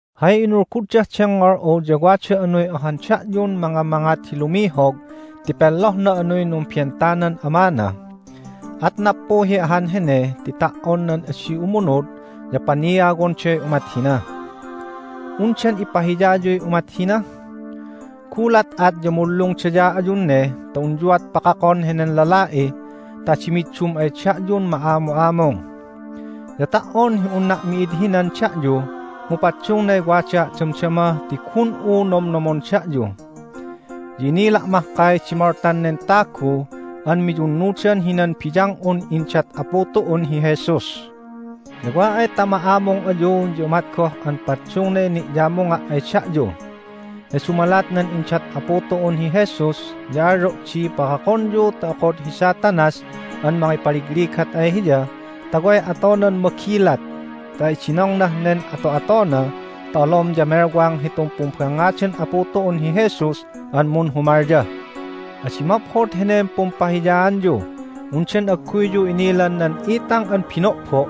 Hay inulguddah dengngol'u ya wada anuy ohan da'yun mangamangat hi lumihog ti penlohna anuy numbentanan amana. At nappuhi ahan hene ti ta"on nan adi umunud ya paniawonday umat hina! Undan ipahiyayuy umat hina? Gulat at ya munlungdaya ayun ne ta unyuat pakakon henen lala'i ta adi middum ay da'yun ma'amu'amung! Ya ta"on hi unna' mi'id hinan da'yu mu paddungnay wadaa' damdama ti gun'u nomnomon da'yu. Ya inila' mahkay di moltan nen tagu an miyunnudan hinan biyang'un indat Apu tu'un hi Jesus. Ya wa ay ta ma'amung ayu ya umat goh an paddungnay ni'yamunga' ay da'yu. Ya dumalat nan indat Apu tu'un hi Jesus ya alyo' di pakakonyu ta okod hi Satanas an mangipaligligat ay hiya ta way atonan magilat ta idinongnah nen ato'atona ta olom ya melwang hitun pumbangngadan Apu tu'un hi Jesus an munhumalya. Adi maphod henen pumpahiyaanyu! Undan agguyyu inilan nan itang an bino'bo'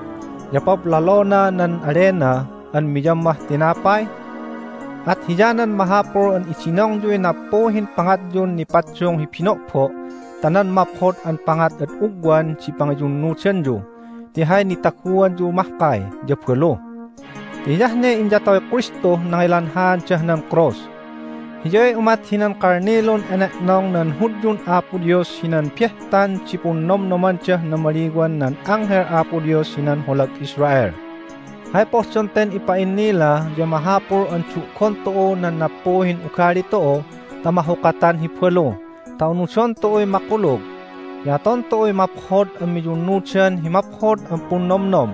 ya pablalona nan alena an miyammah tinapay? At hiyanan mahapul an idinongyuy nappuhin pangatyun nipaddung hi bino'bo' ta nan maphod an pangat ad ugwan di pangiyunnudanyu ti hay nitaguanyu mahkay ya balu, ti hiyah ne inyatoy Kristuh nangilanhaandah nan krus. Hiyay umat hinan kalnilun ene'nong nan Hudyun Apo Dios hinan Behtan di Punnomnomandah Namaliwan nan Anghel Apo Dios hinan Holag Israel. Hay pohdon ten ipa'innila ya mahapul an du'gon tu'u nan nappuhin ugali tu'u ta mahukatan hi balu ta unudon tu'uy makulug, ya aton tu'uy maphod an miyunnudan hi maphod an punnomnom.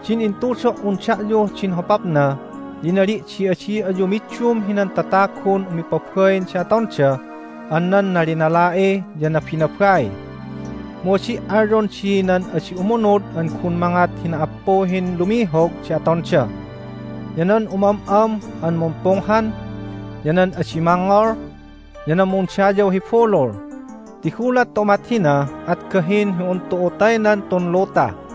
Din intudo"un da'yuh din hopapna ya inali' di adi ayu middum hinan tatagun umipabain di atonda an nan nalinala'i ya nabinabai. Mu adi' alyon di nan adi umunud an gun mangat hi na"appuhin lumihog di atonda, ya nan umam'am an mumpunghan, ya nan adi mangngol, ya nan mundayaw hi bulul, ti gulat ta umat hina at gahin hi un tu'u taynan tun luta!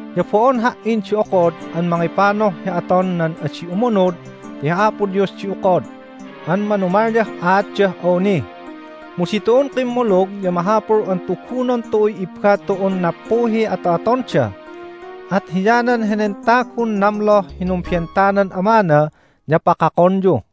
Ya bo'on ha"in di okod an mangipanuh hi aton nan adi umunud ti hi Apo Dios di okod an manumalyah aatdah awni. Mu ditu'un kimmulug ya mahapul an tugunon tu'uy ibba tu'un nappuhiy ato'atonda. At hiyanan henen tagun namloh hi numbentanan amana ya pakakonyu.